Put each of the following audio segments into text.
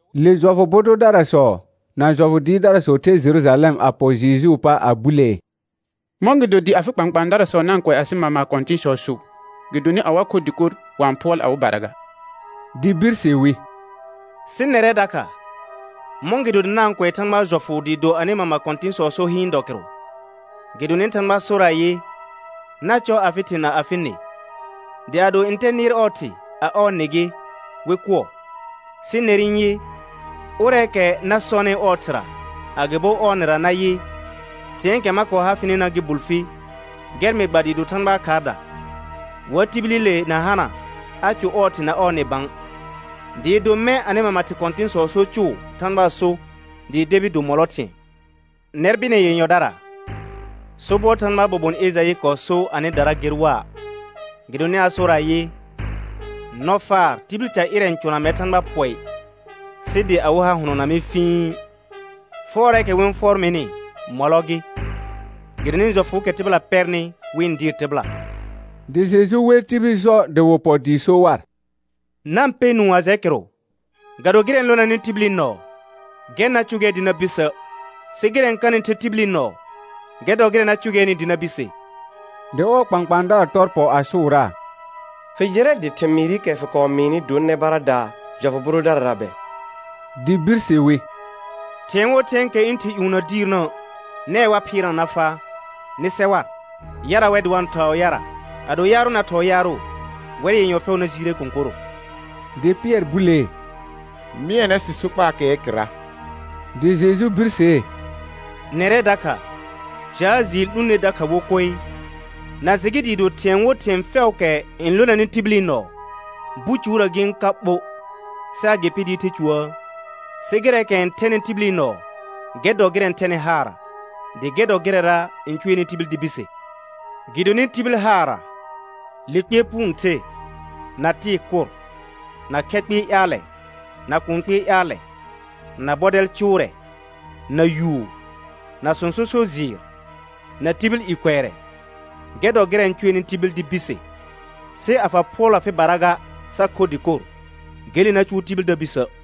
Le jɔfʋ bʋ dʋdarasɔ na jɔfʋ dɩɩrdarasɔ the Jerujalɛm a pɔ Jejuu pa a bulee: Mɔ̃gɩdo dɩ afɩ kpãkpãadarasɔ na-n kʋɛ asɩ mama kɔ̃tɩ̃sɔɔ so? Gɩdonɩ a wa kho dɩkor, wa-n phʋɔl awɩbara ga. Dɩ birse wi: Sɩ nɛrɛ dakha, mɔ̃gɩdo dɩ na-n kʋɛ Thãgbaa jɔfʋ dɩɩ do anɩ mama kɔ̃tɩ̃sɔɔ so hɩɩn dɔ kɩrʋ? Gɩdonɩ Thãgba sor ayɩ: «Na cɔ afɩ thɩ na afɩ nɩ» dɩ «ado ntɛ nɩɩr ɔɔ thɩ, a ɔɔ nɩ gɩ, wɩ kʋɔ.» Sɩ ner n yɩ: Ʋrɛɛkɛ na sɔnɩ ɔɔ thɩra agɩbo ɔɔ nɩra nayɩ: Thɩ̃ɛɛkɛ ma kɔɔ ha fɩnɩna gɩ bul fi, gɛr mɩ gba dɩɩ do Thãgbaa khaarda; wa tibilile na hana a cʋ ɔɔ thɩ na ɔɔ nɩ bã; dɩɩ do mɛ̃ anɩ mama kɔ̃tɩ̃sɔɔ so cʋʋ Thãgbaa so dɩɩ debi do mɔlɔ thɩ̃ɛ. Nɛr bɩnɛ yenyɔdara, sobɔr Thãgbaa bobon Ejaɩ kɔɔ so anɩdara ger waa, gɩdonɩ a sor ayɩ: «Nɔfaar tibil ca ƴɩrɛ n cʋna mɛr Thãgba pɔɩ, sɩ dɩ awɩ ha hʋnɔna mɩ fĩi. Fʋɔrɛɛkɛ wɩ-n fʋɔr mɩnɩ, mɔlɔ gɩ, gɩdonɩ jɔfʋʋkɛ tɩbɩla pɛrnɩ wɩ-n dɩɩr tɩbɩla.» Dɩ Jeju wer tibil jɔ dɩ wɩ pɔ dɩ so war: Na-n pɛ nũu a jɛ kɩrʋ. Ga do gɩrɛ n lonanɩ tibil nɔɔ, gɛr na cʋgɛɛ dɩ na bisə', sɩ gɩrɛ n kanɩ the tibili nɔɔ, gɛr dɔ gɩrɛ na cʋgɛɛnɩ dɩ na bise. Dɩ ɔɔ kpãkpãadara tɔr pɔ a sʋʋraa: Fɩ jɩrɛ dɩ thɩmɩɩrɩkɛ fɩ kɔɔ mɩɩnɩ dor nɛ baradaa jɔfʋ bʋ dʋdarara bɛ? Dɩ birse wi: Thɩ̃ɛ wo thɩ̃ɛɛkɛ ɩ̃ Thɩ ƴũ na diirnə', nɛɛ wa phɩɩrna na faa. Nɩ sɛ war. Yara wɛ dɩ wa-n thɔɔ yara. Ado yaarʋ na thɔɔ yaarʋ, wɛr yenyɔ fɛʋ na jiire kõkorro. Dɩ Pɩɛr bulee: Mɩɛnɛ sɩ sokpaakɛɛ kɩrra. Dɩ Jeju birsee: Nɛrɛ dakha, jaa jɩɩr 'lũ ner dakha wo koe? Na jɩ gɩ dɩɩ do thɩ̃ɛ wo thɩ̃ɛ fɛʋʋkɛ n lonanɩ tibili nɔɔ, bucuurə gɩ-n ka ɓo, sɩ agɩpɩ dɩɩ the cuuəə? Sɩ gɩrɛɛkɛ n thɛnɩ tibili nɔɔ gɛr dɔ gɩrɛ n thɛnɩ haarra, dɩ gɛr dɔ gɩrɛra n cʋɛnɩ tibil dɩ bise. Gɩdonɩ tibil haarra, le kpɩɛr puu n the, na tɩɩ kʋr, na khɛ kpɩɩ ƴaalɛ na kũu kpɩɩ ƴaalɛ, na bɔdɛl cʋʋrɛ, na yuur, na sõso so jɩɩr, na tibil i kʋɛrɛ. Gɛr dɔ gɩrɛ n cʋɛnɩ tibil dɩ bise, sɩ a fa phʋɔl afɩbara ga, sa kho dɩkor, gele na cʋʋ tibil da bisə'.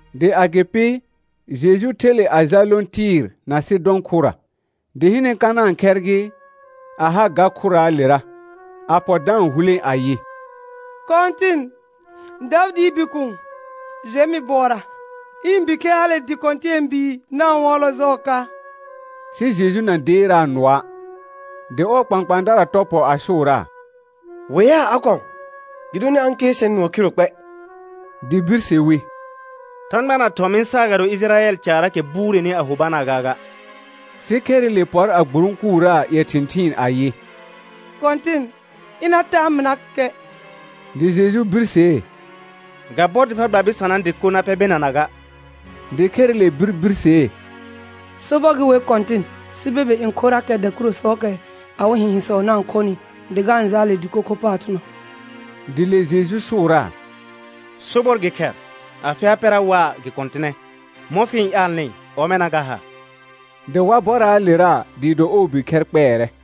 Dɩ agɩpɩ, Jeju the le a jal lõ Tɩɩr na Sɩdɔ̃ khʋra. Dɩ hɩnɛ Kanãa khɛr gɩ, a ha ga khʋraalera, a pɔ da-n hulẽ ayɩ: Kɔ̃tɩn, Davɩdɩɩ Bikuun, jɛ mɩ bʋɔra. Ɩ̃ bikhɛr hale dɩ kɔ̃tɛɛbuu na-n hʋɔlɔ jɔɔ ka. Sɩ Jeju na deeraa nʋɔa', dɩ ɔɔ kpãkpãadara tɔ pɔ a sʋʋraa: Weaa a kɔ̃, gɩdonɩ a-n kɩɛr sɛr nʋɔ khiro kpɛ. Dɩ birse wi: Thãgba na thɔ̃ mɩ saagado Ɩjɩrayɛl caraakɛ bureni a ho banaa gaaga. Sɩ khɛrɩle pɔr a gburõkuraa ƴɛ thɩ̃thɩɩn ayɩ: Kɔ̃tɩn, ɩna taa mɩnakɛ. Dɩ Jeju birsee: Ga bɔr dɩ fa gba bɩsanaa dɩko na pɛ benana ga. Dɩ khɛrɩle bir birsee: Sobɔr gɩ wer Kɔ̃tɩn, sɩ bebe n khorrakɛ dakurusɔɔkɛ awɩ hɩ̃hɩ̃sɔ na-n khonɩ dɩ ga-n jaal le dɩko kho paar thʋnɔ. Dɩ le Jeju sʋʋraa: Sobɔr gɩ khɛr, afɩ ha pɛra waa gɩ kɔ̃tɩnɛ. Mɔ̃ fɩ-n ƴaalnɩ, ɔmɛna ga ha. Dɩ wa bɔraalera dɩɩ do ɔɔ bikhɛr kpɛɛrɛ.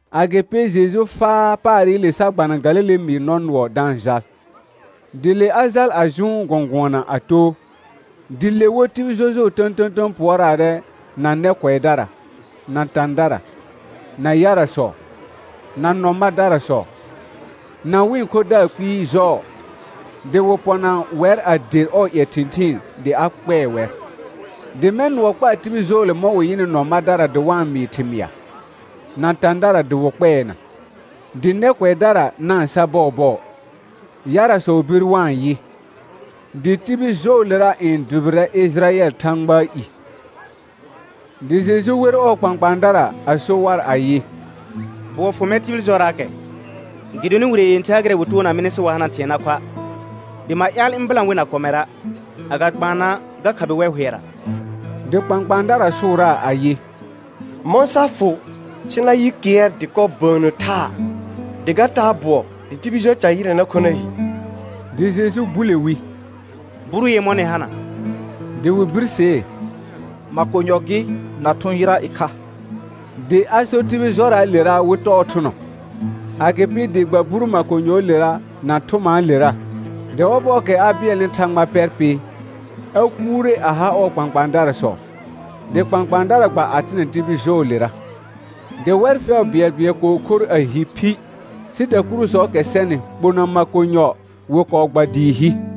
Agɩpɩ Jeju faa paarɩle sa gbana Galile mɩɩr nɔ nʋɔ da-n jal. Dɩ le a jal a jʋʋn gɔ̃gʋɔna a too. Dɩ le wo tibil jɔjʋɔ tə̃tə̃tə̃ pʋɔraarɛ na nɛ kʋɛdara, na tãdara, na yarasɔ, na nɔ madarasɔ, na wɩ̃ khodaar kpɩɩ jɔɔ. Dɩ wɩ pɔna wɛr a der ɔɔ ƴɛ thɩ̃thɩɩn dɩ a kpɛɛ wɛr. Dɩ mɛ̃ nʋɔ kpaa tibil jɔɔle mɔ̃ wɩ yɩnɩ nɔ madara dɩ wa-n mɩɩ thɩmɩa, na tãdara dɩ wɩ kpɛɛna, dɩ nɛ kʋɛdara na-n sa bɔɔbɔɔ, yarasɔ bir wa-n yɩ. Dɩ tibil jɔɔlera n dʋbɩrɛ Ɩjɩrayɛl Thãgbaa i. Dɩ Jeju wer ɔɔ kpãkpãadara a so war ayɩ: Bʋɔ fʋ mɛr tibil jɔraakɛ, gɩdonɩ wire yẽther ha gɩrɛ wɩ toona mɩnɩ, sɩ wa hana thɩ̃ɛ na khoa'. Dɩ ma ƴaal ɩ̃ bɩlã wɩ na kɔmɛra' agakpaana ga khabɩ wɛr hʋɛra. Dɩ kpãkpãadara sʋʋraa ayɩ: Mɔ̃ sa fʋ sɩ na yɩ kɩɛr dɩkɔ bəənnə thaa, dɩ ga taa bʋɔ dɩ tibil jɔ ca ƴɩrɛ na kho na hi? Dɩ Jeju bule wi: Buru yemɔ̃ nɩ hana? Dɩ wɩ birsee: Makonyɔ gɩ na thʋ̃ yɩra ɩkha. Dɩ a sor tibil jɔraalera wɩ tɔɔ thʋnɔ; agɩpɩ dɩ gba buru makonyɔɔlera na thʋmaalera. Dɩ ɔbɔɔkɛ a bɩɛlnɩ Thãgba pɛr pɩ, a kuure a ha ɔɔ kpãkpãadarasɔ, dɩ kpãkpãadara gba a tɩnɛ tibil jɔɔlera. Dɩ wɛr fɛʋ bɩɛlbɩɛl kɔɔ khor a hi phi, sɩ dakurusɔɔkɛ sɛnɩ kpona makonyɔ wɩ kɔɔ gba dɩɩ hi.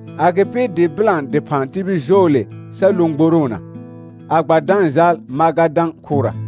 Agɩpɩ dɩ bɩlã dɩphã tibil jɔɔle sa lõ gboroona, a gba da-n jal Magadã khʋra.